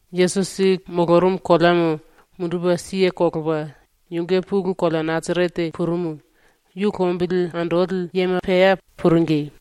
Yesusi molorumu koleamo mundupe kelepa yunge pulu kolea ⸤Nasarete⸥ purumu, yu lombili andoli yema pea puringi.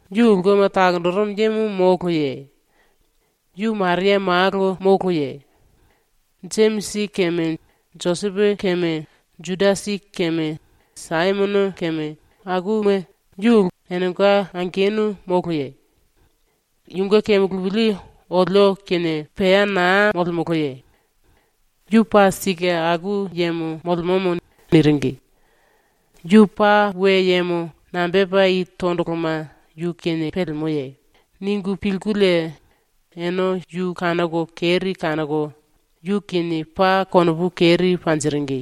Yu ulkema takonjirimu yemo moloye? Yu Maria malo moloye? Jemisi keme Josepo keme, Judasi keme Saimono keme, enenga angenu moloye? Yunge kemulupili olio kinie pea naa molemoloye? ⸤Yu paa sike aku yemo molemomo⸥.” niringi. ‘Yu paa we yemo nambe tepa i tondoloma yu kinie pelemoye?’ ningu pilkulie ene yu kanoko keri kanoko yu kinie paa konopu keri panjiringi.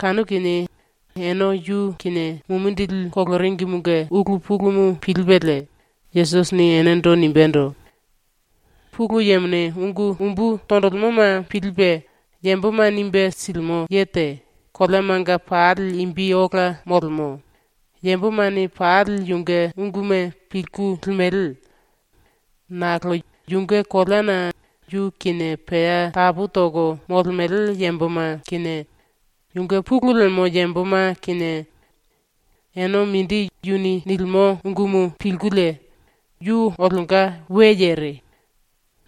Kanu kinie ⸤ene yu kinie mumindili koloringimunge ulu pulumu pilipelie⸥ Yesusini enendo nimbendo: “Pulu Yemone ungu umbu tonjilimoma pilipe yamboma nimbe silimo ye te koleamanga pali imbi ola molemo, yambomane pali yunge unguma pilku limele. Nakolo yunge koleana yu kinie pea tapu toko molemele yamboma kinie, yunge pulu lemo yamboma kinie, ene mindi yuni nilimo ungumu pilkulie ‘Yu olionga we yere.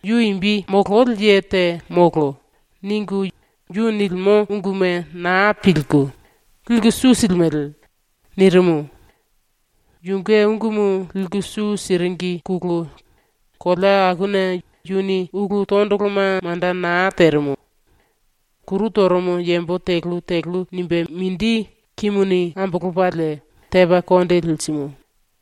Yu imbi mololi ye te molo.’ ningu yu nilimo unguma naa pilku, liku su silimele.” nirimu. ⸤Yunge ungumu liku su siringine⸥ kolea akuna yuni ulu tondoloma manda naa terimu. Kuru torumu yambo telu telu nimbe mindi kimuni ambolopalie tepa konde lirimu.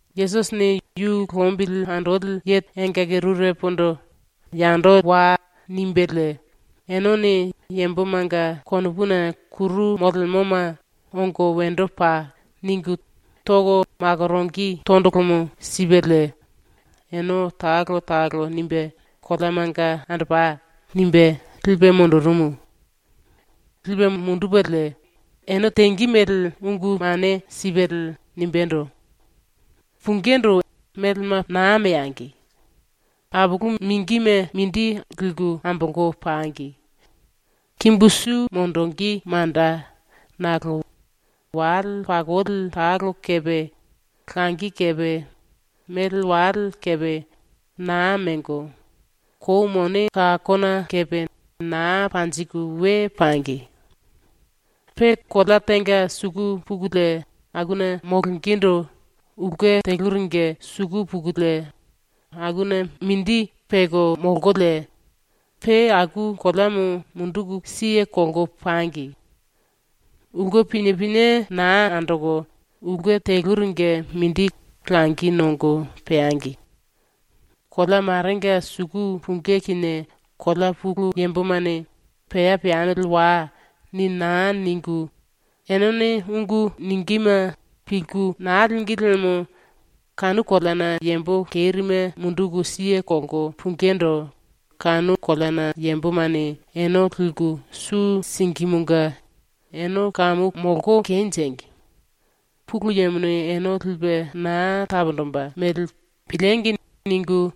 Yesusini yu lombili andoli engaki rurepondo “Wai.” nimbelie enene yambomanga konopuna kuru molemoma “Ongo wendo pai.” ningu toko makoronge tondolomo sipelie ene talo talo nimbe “Koleamanga andopai.” nimbe lipe mundurumu. ⸤Lipe mundupelie⸥ ene tenge mele ungu mane sipelie nimbendo: “Pungindu ene melema naa meangi. Apulu mingime mindi liku ambolko pangi. Kimbu su monjingí manda nakolo wale pakoli talo kepe langi kepe mele wale kepe naa mengo, kou mone kakona kepe naa panjiku we pangi. “Pe kolea tenga suku pukulie akuna molongendo ulke teluringe suku pukulie akuna mindi peko molkolie pe aku koleamo munduku kelko pangi. ⸤Ulke pinie pinie naa andoko ulke teluringe mindi langi nongo peangi.⸥ Kolea marenga suku pungí kinie kolea pulu yambomane “Pea peamili wai.” ni naa ningu enene ungu ningíme pilku naa língi liemo kanu koleana yambo kerime munduku kelko pungindu kanu koleana yambomane ene liku su singímunge ‘Ene kamu molko kenjengi! Pulu Yemone ene lipe naa taponjimbe mele piliengi!’ ningu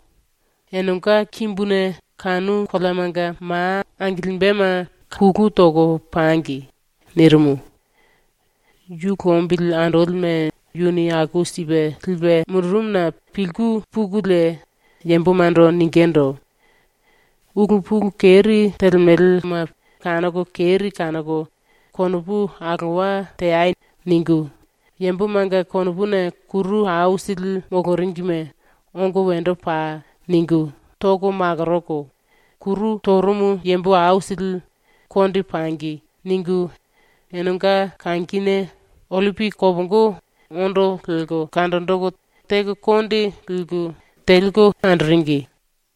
enenga kimbuna kanu koleamanga ma angilimbema kulu toko pangi.” nirimu. ⸤Yu lombili andolime yuni aku sipe lipe mundurumuna pilku⸥ pukulie yambomando ningindu: “Ulu pulu keri telemelema kanoko keri kanoko konopu alowa teai.” ningu yambomanga konopuna kuru aisili moloringime ⸤‘Ongo wendo pai.’ ningu⸥ toko makoroko, kuru torumu yambo aisili ‘Konde pangi.’ ningu enenga kangine ollipi kopongo ondo lelko kanjinjiku teko konde liku, teliku andoringi.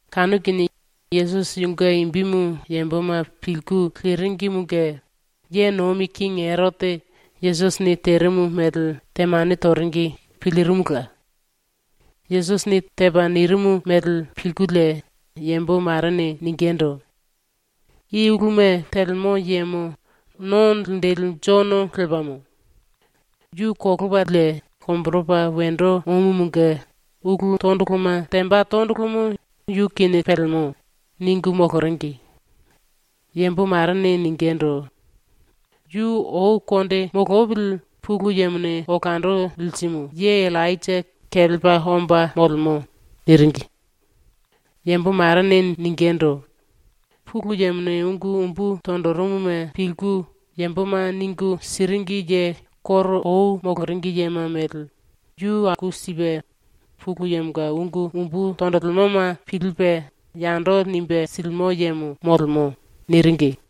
Kanu kinie Yesusi yunge imbimu yamboma pilku leringimunge ye nomi kingi Erote Yesusini terimu mele temane toringi pilirimula. ⸤Yesusini tepa nirimu mele pilkulie⸥ yambo marene ningindu: “I uluma telemo yemo No Linjili Jono lepamo! Yu kolopalie lomboropa wendo omumunge ulu tondoloma temba tondolomo yu kinie pelemo.” ningu moloringi. Yambo marene ningindu: “Yu ⸤ou konde molopili Pulu Yemone olando lirimu ye⸥ Illainja kelepa omba molemo.” niringi. Yambo marene ningindu: “Pulu Yemone ungu umbu tonjirimuma pilku yamboma ningu siringi ye koro ou moloringi yema mele yu aku sipe Pulu Yemonga ungu umbu tonjilimoma pilipe yando nimbe silimo yemo molemo.” niringi.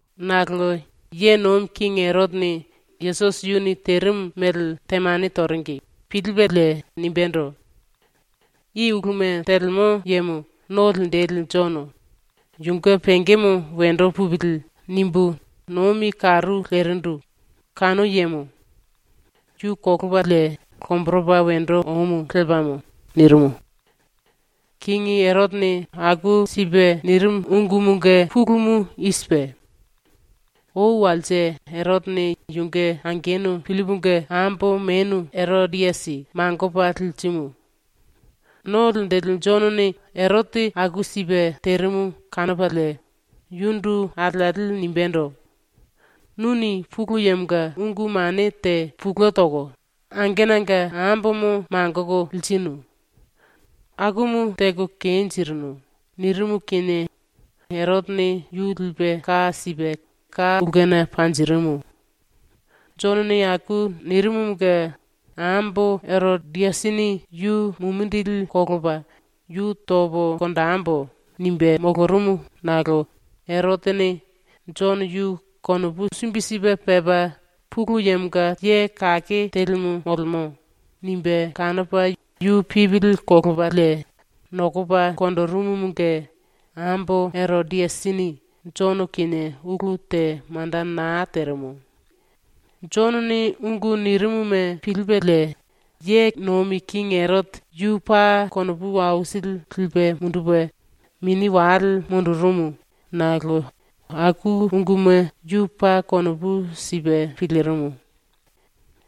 Nakolo ye nomi kingi Erotene ⸤Yesusi yuni terimu mele temane toringi⸥ pilipelie nimbendo: “I uluma telemo yemo ⸤No Linjili⸥ Jono, ‘Yunge pengemo wendo pupili.’ nimbu nomi karu lerindu kanu yemo. Yu kolopalie lomboropa wendo omu lepamo.” nirimu. ⸤Kingi Erotene aku sipe nirimu ungumunge pulumu i sipe:⸥ Ou walse Erotene yunge angenu Pillipunge ambo menu Erodiasi mangopa lirimu. ⸤No Linjili⸥ Jonone Erote aku sipe terimu kanopalie yundu alieli nimbendo: “Nuni ⸤Pulu Yemonga⸥ ungu mane te pulue toko angenanga ambomo mangoko lirinu. Akumu teko kenjirinu.” nirimu kinie Erotene yu lipe ka sipe ka ulkena panjirimu. Jonone aku nirimumunge ambo Erodiasini yu mumindili kolopa “Yu topo konjembo.” nimbe molorumu nakolo Erotene ‘Jono yu konopu sumbi sipe pepa Pulu Yemonga ye kake telimu molemo.’ nimbe kanopa yu pipili kolopalie nokopa konjirimumunge ambo Erodiasini Jono kinie ulu te manda naa terimu. Jonone ungu nirimuma pilipelie ye nomi kingi Erote yu paa konopu aisili lipe mundupe mini wale mundurumu nakolo aku unguma yu paa konopu sipe pilirimu.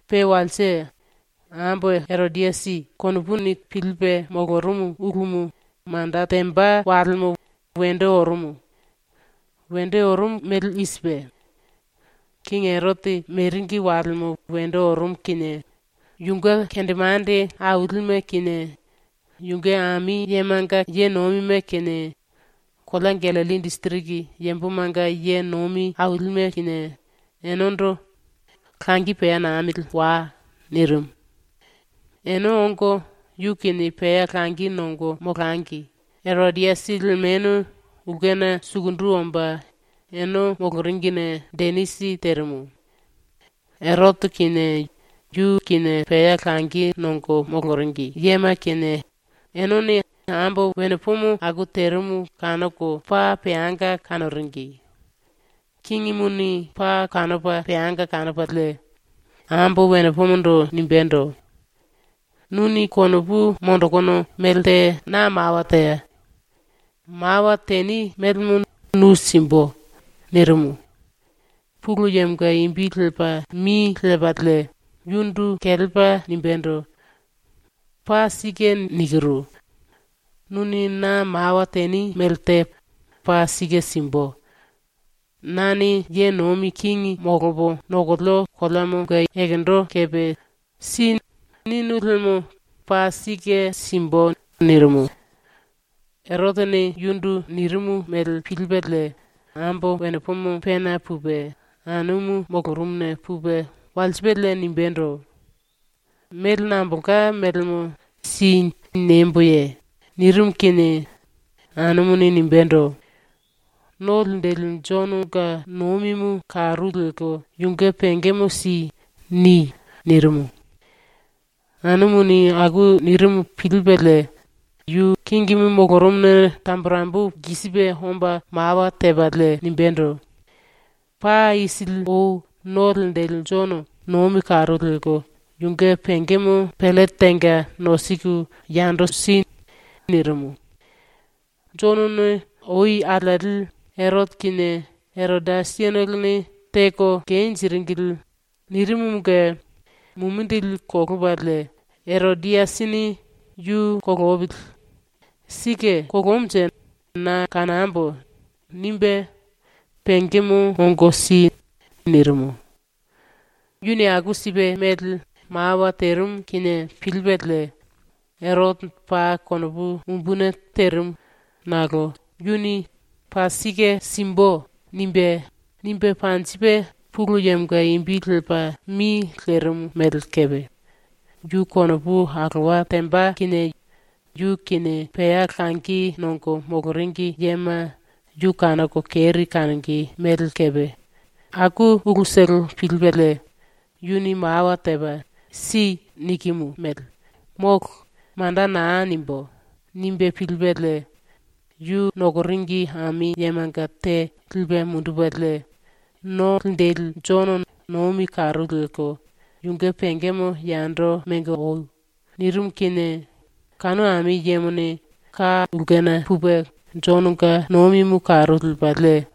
Pe walse, ⸤ambo Erodiasi⸥ konopuni pilipe molorumu ulumu manda temba walemo wendo orumu. Wendo orumu mele i sipe: Kingi Erote meringi walemo wendo orumu kinie yunge kendemande ailime kinie, yunge ami yemanga ye nomime kinie, kolea Gallilli disiriki yambomanga ye nomi ailime kinie, enendo “Langi pea namili wai.” nirimu. ⸤Ene ongo yu kinie pea langi nongo molangi⸥ Erodiasi lemenu ulkena sukundu omba ene moloringine denisi terimu. Erote kinie, yu kinie pea langi nongo moloringi yema kinie enene ambo wenepomo aku terimu kanoko paa peanga kanoringi. Kingimuni paa kanopa peanga kanopalie ambo wenepomondo nimbendo: “Nuni konopu monjikinu melte na mawa téa. Mawa teni melemo nu simbu.” nirimu. Pulu Yemonga imbi lepa mi lepalie yundu kelepa nimbendo: “Paa sike nikiru. Nuni na mawa teni mele te paa sike simbu. Nane ye nomi kingi molopo nokolio koleamo ekendo kepe “Si.” ninu liemo paa sike simbu.” nirimu. Erotene yundu nirimu mele pilipelie ambo wenepomo pena pupe, anumu molorumuna pupe walsipelie nimbendo: “Mele nambolka melemo ‘Si.’ niemboye?” nirimu kinie anumuni nimbendo: “ “No Linjili Jononga ⸤nomimu karu lelko yunge⸥ pengemo si.” ni.” nirimu. Anumuni aku nirimu pilipelie yu kingimu molorumuna tamburembu lkisipe omba mawa tepalie nimbendo: “Paa isili ou No Linjili Jono ⸤nomi karu lelko⸥ yunge pengemo pellete tenga nosiku yando si.” nirimu. ⸤Jonone ou alieli “Erote kinie Erodiasitolone teko kenjiringili.” nirimumunge mumindili kolopalie Erodiasini ‘Yu kolopili. Sike kolomunje na kanambo.’ nimbe “Pengemo ongo si.” nirimu.⸥ Yuni aku sipe mele mawa terimu kinie pilipelie Erote paa konopu umbuni terimu nakolo yuni “Paa sike simbu.” nimbe, nimbe panjipe Pulu Yemonga imbi lepa mi lerimu mele kepe, yu konopu alowa temba kinie yu kinie pea langi nongo moloringi yema yu kanoko keri kanonge mele kepe, aku ulutolo pilipelie, “Yuni mawa tepa “Si.” nikimu mele “Molo.” manda naa nimbú.” nimbe pilipelie yu nokoringi ami yemanga te lipe mundupelie “⸤No Linjili⸥ Jono ⸤nomi karu lelko⸥ yunge pengemo yando mengo oi.” nirimu kinie kanu ami yemone ka ulkena pupe Jononga nomimu karu lepalie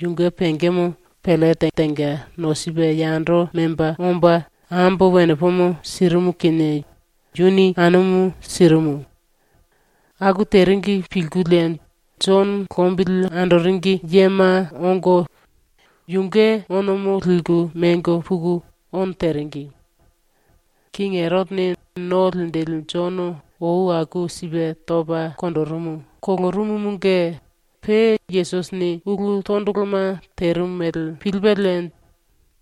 yunge pengemo pellete tenga nosipe yando memba omba ambo wenepomo sirimu kinie yuni anumu sirimu. Aku teringi pilkulie Jono lombili andoringi yema ongo yunge onomo liku mengo puku ono teringi. ⸤Kingi Erotene No Linjili Jono ou aku sipe topa konjirimu kolorumumunge pe Yesusini ulu tondoloma terimu mele pilipelie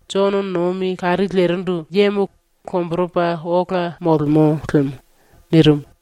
“Jono nomi karu lerindu yemo lomboropa ola molemo lemo.” nirimu.⸥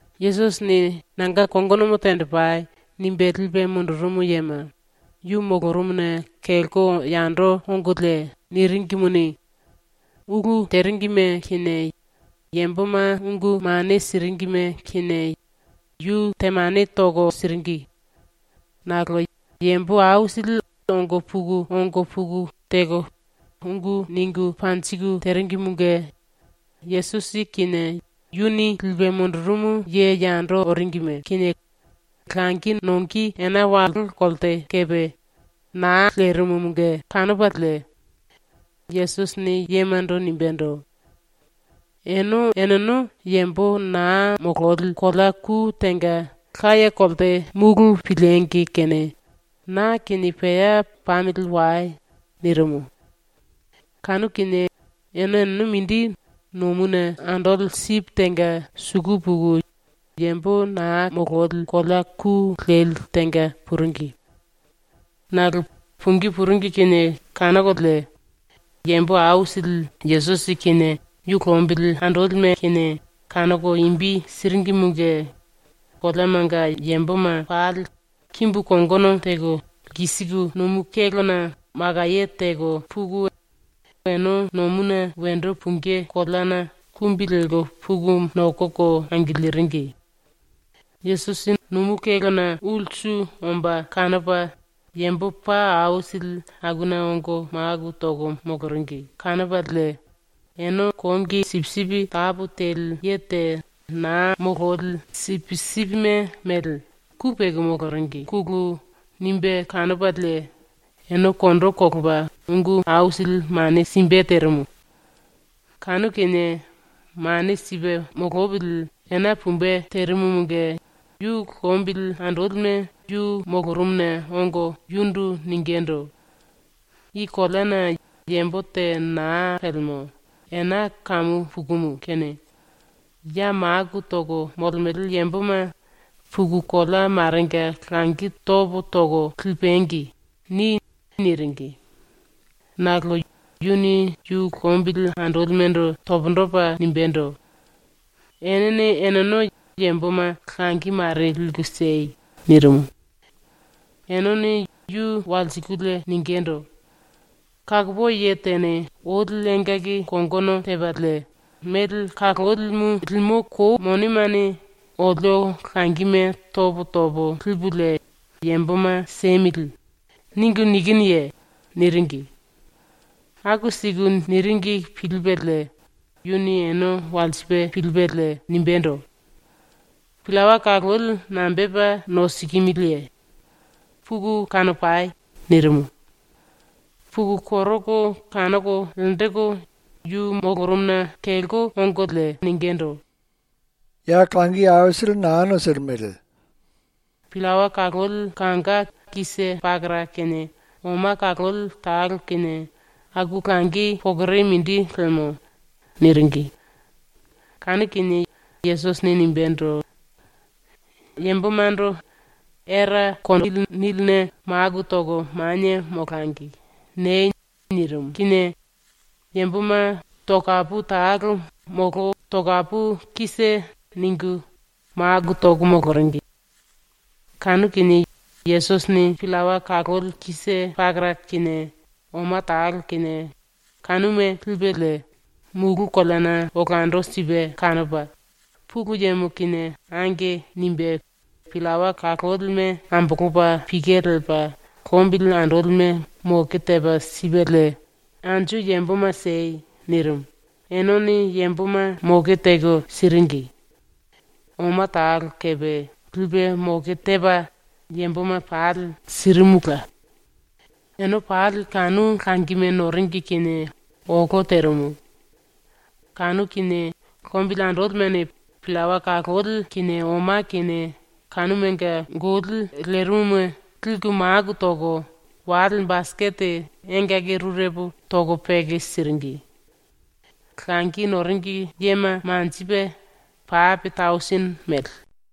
Yesusini “Nanga kongonomo tenjipai.” nimbe lipe mundurumu yema yu molorumuna kelko yando ongolie niringimuni, ulu teringime kinie yamboma ungu mane siringime kinie yu temane toko siringi. Nakolo yambo aisili ongo puku ongo puku ⸤teko ungu ningu panjiku⸥ teringimunge Yesusi kinie ⸤yuni lipe mundurumu ye yando oringime⸥ kinie langi nonge ena wallo kolte kepe naa lerimumunge kanopalie Yesusini yemando nimbendo: “Ene eneno yambo naa mololi kolea ku tenga laye kolte mulu piliengi kene na kinie pea pamili wai.” nirimu. Kanu kinie ene eneno mindi nomuna andoli sipi tenga suku puku yambo naa mololi kolea ku leli tenga puringi. Nakolo pungí puringi kinie kanokolie yambo aisili Yesusi kinie yu lombili andolime kinie kanoko imbi siringimunge koleamanga yamboma pali kimbu kongono teko lkisiku nomu kélona makaye teko puku ene nomuna wendo pungí koleana kumbi lelko puku nokoko angiliringi. Yesusi nomu kélona ulsu omba kanopa yambo paa aisili akuna ongo maku toko moloringi kanopalie ene kongi sipisipi tapu teli ye te naa mololi sipisipime mele ku peko moloringine nimbe kanopalie ene kondo kolopa ungu aisili mane simbe terimu. Kanu kinie ⸤mane sipe molopili⸥ ena pumbe terimumunge yu lombili andolime yu molorumuna ongo yundu ningindu: “I koleana yambo te naa pelemo, ena kamu pukumu kene ya maku toko molemele yamboma “Puku kolea marenga langi topo toko lipangi.” ni.” niringi. Nakolo yuni ⸤yu lombili andolimendo⸥ pundu topa nimbendo: “Enene eneno yamboma langi mare liku siei.” nirimu. Enene yu walsikulie ningindu: “‘Kakopoi ye tene oli engaki kongono tepalie mele kalolimu limo kou monemane olio langime topo topo lipulie yamboma siemili.’ ningu nikinuye?” niringi. ⸤Aku siku niringi pilipelie⸥ yuni ene walsipe pilipelie nimbendo: “Pillawa kaloli nambepa nosikimiliye? Puku kanopai.” nirimu. Puku koroko kanoko lenjiku yu molorumuna kelko ongolie ningindu: “Ya langi aisili molo. Pillawa kaloli kanga te pakara kinie oma kaloli talo kinie ⸤aku langi pokore mindi lemo⸥.” niringi. Kanu kinie Yesusini nimbendo: “Yambomando “Era kondili niline maku toko manie molangi.” niei.” nirimu kinie yamboma tokapu talo molo tokapu kise ningu maku toko moloringi. Kanu kinie Yesusini pillawa kaloli te pakara kinie oma talo kinie kanuma lipelie mulu koleana olando sipe kanopa ⸤Pulu Yemo kinie⸥ “Ange.” nimbe pillawa kalolime ambolopa pike lepa lombili andolime moke tepa sipelie “Anju yamboma siei.” nirimu, ⸤enene⸥ yamboma ⸤moke teko siringi⸥. Oma talo kepe lipe moke tepa yamboma pali sirimula. Ene pali kanu langime noringi kinie olo terimu. Kanu kinie lombili andolimene pillawa kaloli kinie oma kinie kanumanga goli lerimuma liku maku toko wale basikete engaki rurepo toko peke siringi. Langi noringi yema manjipe pape tausini mele.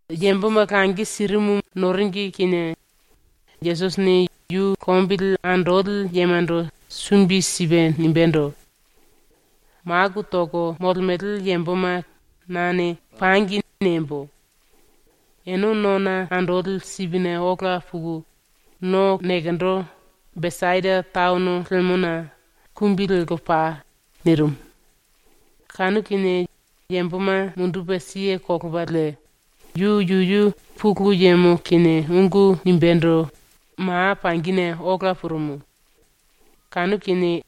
⸤Yamboma langi sirimu noringi⸥ kinie Yesusini yu lombili andoli yemando sumbi sipe nimbendo: “Maku toko molemele yamboma nane “Pangi.” niembo. Ene nona andoli sipine ola puku no nekendo, Besaida taono lemona, kumbi lelko pai.” nirimu. Kanu kinie yamboma mundupe kelepalie yu yuyu Pulu Yemo kinie ungu nimbendo ma pangine ola purumu. Kanu kinie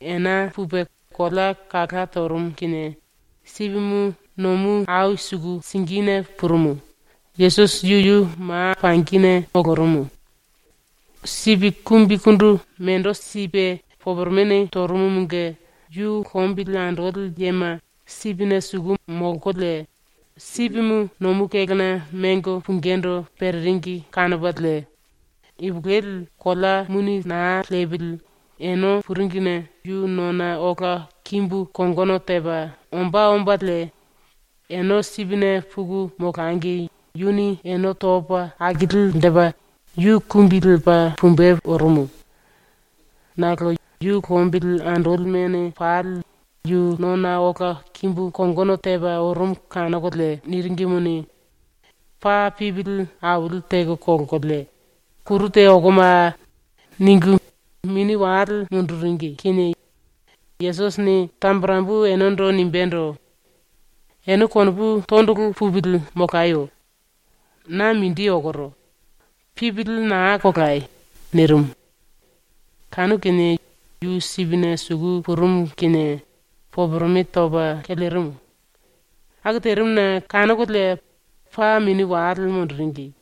ena pupe kolea kala torumu kinie sipimu nomu ai suku singine purumu, Yesusi yuyu ma ⸤pangi⸥ ne molorumu. Sipi kumbikundu mendo sipe poporomene torumumunge ⸤yu lombili andoli yema sipine suku molkolie⸥ sipimu nomu kélona mengo pungindu pereringi kanopalie ipulueli kolea muni naa lepili ene puringine yu nona ola kimbu kongono tepa ombá ombalie ene sipine puku molangi yuni ene topa akilinjipe yu kumbi lepa pumbe orumu. Nakolo yu lombili andolimene pali yu nona ola kimbu kongono tepa orumu kanokolie niringimuni, paa pipili aili teko kolkolie “Kuru te okomaa!” ningu mini wale munduringi kinie Yesusini tamburembu enendo nimbendo: “Ene konopu tondolo pupili molayo. Na mindi okoro. Pipili naa kolai.” nirimu. Kanu kinie yu sipine suku purumu kinie poporome topa kelerimu. Aku terimuna kanokolie paa mini wale munduringi.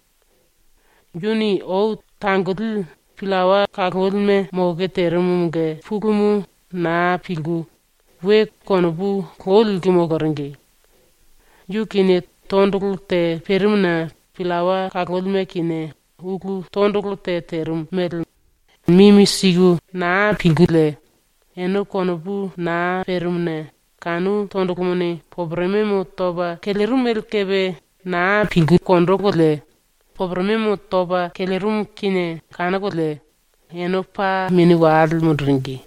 Yuni ⸤ou tangoli⸥ pillawa kalolime ⸤moke⸥ terimumunge pulumu naa pilku we konopu lou lelko moloringi. Yu kinie tondolo te perimuna pillawa kalolime kinie ulu tondolo te terimu mele mimi siku naa pilkulie ene konopu naa perimuna kanu tondolomone poporomemo topa kelerimu mele kepe naa pilkulie poporomemo topa kelerimu kinie kanokolie ene paa mini wale munduringi.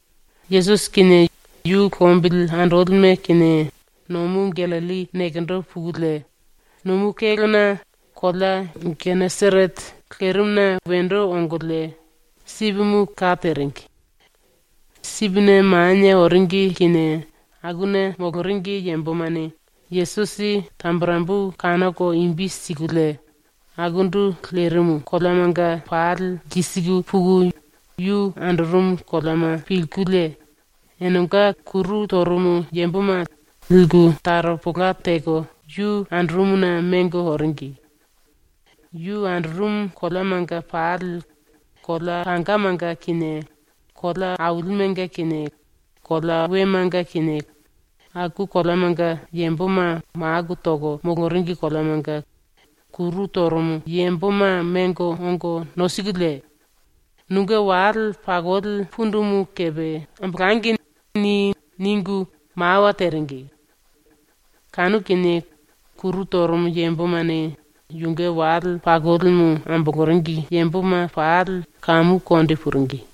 ⸤Yesusi kinie yu lombili andolime kinie⸥ nomu ⸤Gallilli⸥ nekendo pukulie nomu kélona kolea Geneserete lerimuna wendo ongolie sipimu ka teringi. Sipine manie oringi kinie akuna moloringi yambomane Yesusi tamburembu kanoko imbi sikulie akundu lerimu koleamanga pali lkisiku puku yu andorumu koleama pilkulie enenga kuru torumu yamboma liku taropola teko yu andorumuna mengo oringi. Yu andorumu koleamanga pali, kolea kangamanga kinie, kolea ailimenga kinie, kolea wemanga kinie, aku koleamanga yamboma maku toko moloringi koleamanga kuru torumu yamboma mengo ongo nosikulie, “‘Nunge wale pakoli pundumu kepe ambolangi.’ ni.” ningu mawa teringi. Kanu kinie kuru torumu yambomane yunge wale pakolimu amboloringi yamboma pali kamu konde puringi.